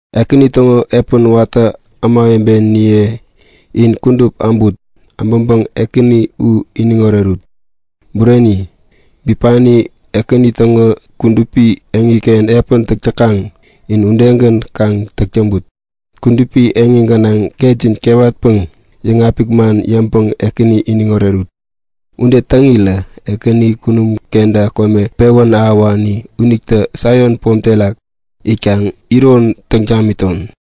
Ekäni täŋo epän watä ämawebeniye in kudup äbut! Äbäŋpäŋ Ekäni u iniŋ orerut! Bureni, bipani Ekäni täŋo kudupi yotken epän täk täkaŋ in udegän kaŋ täk täŋput. Kudupi yot gänaŋ ketjin kewatpäŋ yäŋapik man yäŋpäŋ Ekäni iniŋ orerut! Ude täŋirä Ekäni kunum kenta kome pewän ahäwani unitä Saion pom terak itkaŋ iron täŋ tamiton!